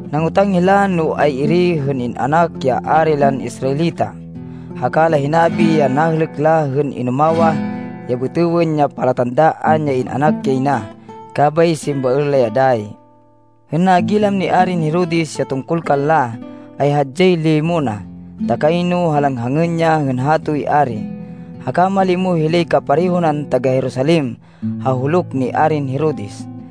Nangotang hila no ay-iri hên in-anak ya ari lan Israelita. Haka la hinabi ya nahêlêk la hên inumawah ya bêtêwên ya palatandaan ya in-anak yay na, kabay simbaên la ya dayi. Hên nagilam ni Arin Herodes ya tungkol kanla, ay hadyay limo na, ta kayno halanghangên ya hên bayoy Ari. Haka malimo hilay kapareho nan taga-Jerusalem ha huluk ni Arin Herodes.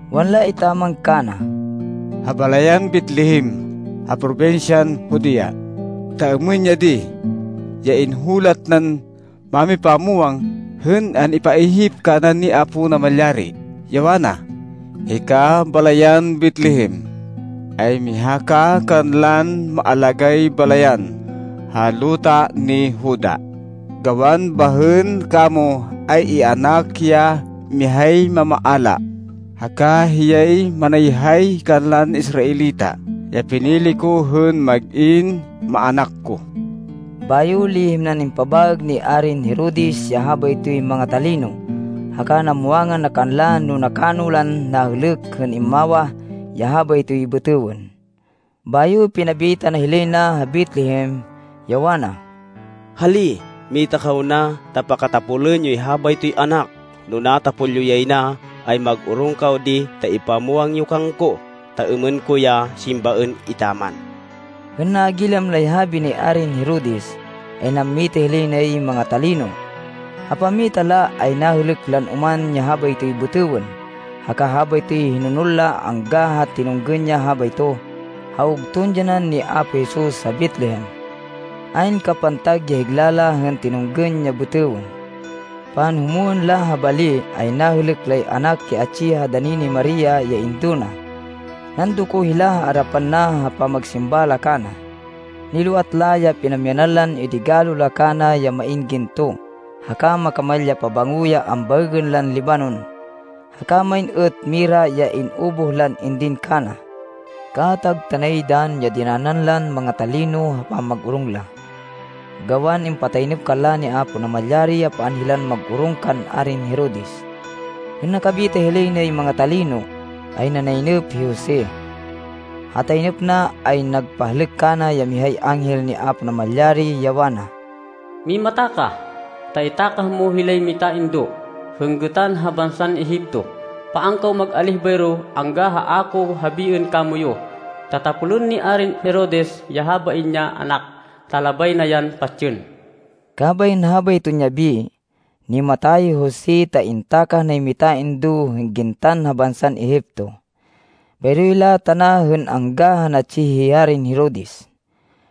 Wanla etaman kana, “Ha balayan Betlehem ha probinsyan Judea, ta êmên ya di ya inhulat nan mámipamwang hên an-ipaihip kana ni Apo Namalyari, ya wana, ‘Hika balayan Betlehem, ay miha ka kanlan maalagáy balayan ha luta ni Juda, gawan bahên kamo ay ianak ya mihay mamaala, haka hiyay manayhay kanlan Israelita ya pinili ko hên mag-in maának ko.’” Bayo lihim nan impabaêg ni Arin Herodes ya habaytoy manga-talino, haka namwangan na kanla no nakano lan nahêlêk hên immawah ya habaytoy bêtêwên. Bayo pinabita na hilay na ha Betlehem, ya wana, “Hali, mita kaw na, ta pakatapolên yoy habaytoy anak. No natapol yo yay na, ay mag-orong kaw di ta ipamwang yo kangko, ta êmên ko ya simbaên etaman.” Hên nagilam lay habi ni Arin Herodes, ay nammita hilay nay manga-talino. Ha pammita la, ay nahêlêk lan oman ya habaytoy bêtêwên, haka habaytoy hinonol la angga ha tinunggên ya habayto, ha ugton dyanan ni Apo Jesus ha Betlehem. Ayn kapantag ya higla la hên tinunggên ya bêtêwên. Panhumwên la ha bali, ay nahêlêk lay anak ya atsi ha dani ni Maria ya indo na. Nandoko hila ha arapan na ha pamagsimba la kana. Niloat la ya pinamyanan lan idigalo la kana ya main ginto, haka makamal ya pabango ya ambaêgên lan libanon, haka main êt mira ya in-ubuh lan indin kana. Kaatag tanay dann ya dinanan lan manga-talino ha pamag-orong la, gawan impataynêp kanla ni Apo Namalyari, ya paan hilan mag-orong kan Arin Herodes. Hên nakabita hilay nay manga-talino, ay nanaynêp hi Jose. Ha taynêp na, ay nagpahlêk kana ya mihay anghel ni Apo Namalyari, ya wana, “Mimata ka, ta itákah mo hilay mitaindo, hên gêtan ha bansan Egipto. Paan kaw mag-alíh bayro, angga ha a ko habiên kamoyu, ta tapolên ni Arin Herodes ya habain ya anak, ta labay na yan patsên.” Kabay hên habayton yabi, nimata ya hi Jose ta intakah nay mitaindo hên gintan ha bansan Egipto. Bayro hila tana hên angga ha natsi hi Arin Herodes.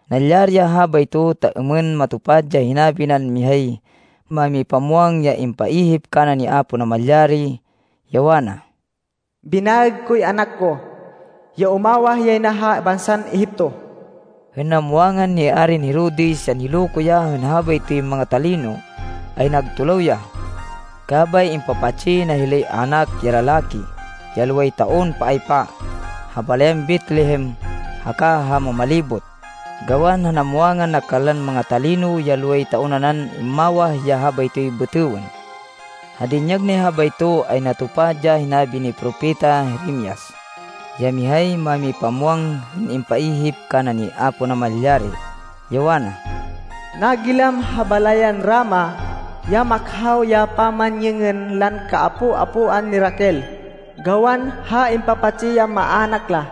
Nalyari ya habayto ta êmên matupad ya hinabi nan mihay mámipamwang ya impaihip kana ni Apo Namalyari, ya wana, “Binaêg koy anak ko, ya umawah yay na ha bansan Egipto.” Hên namwangan ni Arin Herodes ya niloko ya hên habaytoy manga-talino, ay nagtulaw ya. Kabay impapatsi na hilay anak ya lalaki, ya loway taon paaypa, ha balayan Betlehem haka ha mamalibot, gawan ha namwangan na kanlan manga-talino ya loway taon nanan immawah ya habaytoy bêtêwên. Ha dinyag nay habayto, ay natupad ya hinabi ni Propeta Jeremias, ya mihay mámipamwang hên impaihip kana ni Apo Namalyari, ya wana, “Nagilam ha balayan Rama ya makhaw ya pamanyêngên lan kaapo-apoan ni Raquel gawan ha impapatsi ya maának la.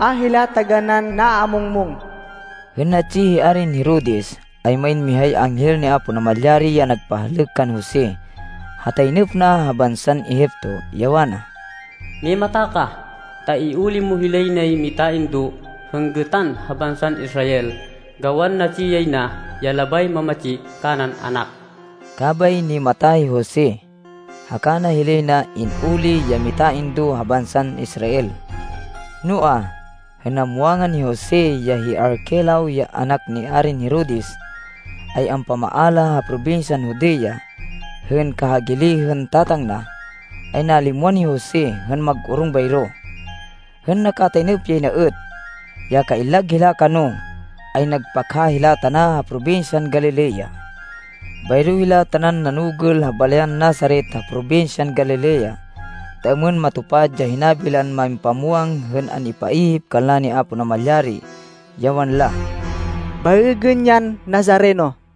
A hila taganán naamungmung.” Hên natsi hi Arin Herodes, ay main mihay anghel ni Apo Namalyari ya nagpahlêk kan Jose ha taynêp na ha bansan Egipto, ya wana, “Mimata ka, ta iuli mo hilay nay mitaindo, hên gêtan ha bansan Israel, gawan natsi yay na, ya labay mamatsi kanan anak.” Kabay nimata hi Jose, haka na hilay na in-uli ya mitaindo ha bansan Israel. Noa, hên Namwangan ni Jose ya hi Arquelao ya anak ni Arin Herodes, ay ampamaala ha probinsyan Judea hên kahagili hên tatang na, ay nalimwan hi Jose hên mag-orong bayro. Hên nakataynêp yay na êt, ya kaillag hila kano, ay nagpakha hila tana ha probinsyan Galilea. Bayro hila tanan nanugêl ha balayan Nazaret ha probinsyan Galilea, ta êmên matupad ya hinabi lan mámipamwang hên an-ipaihip kanla ni Apo Namalyari, ya wanla, “Baêgên yan Nazareno.”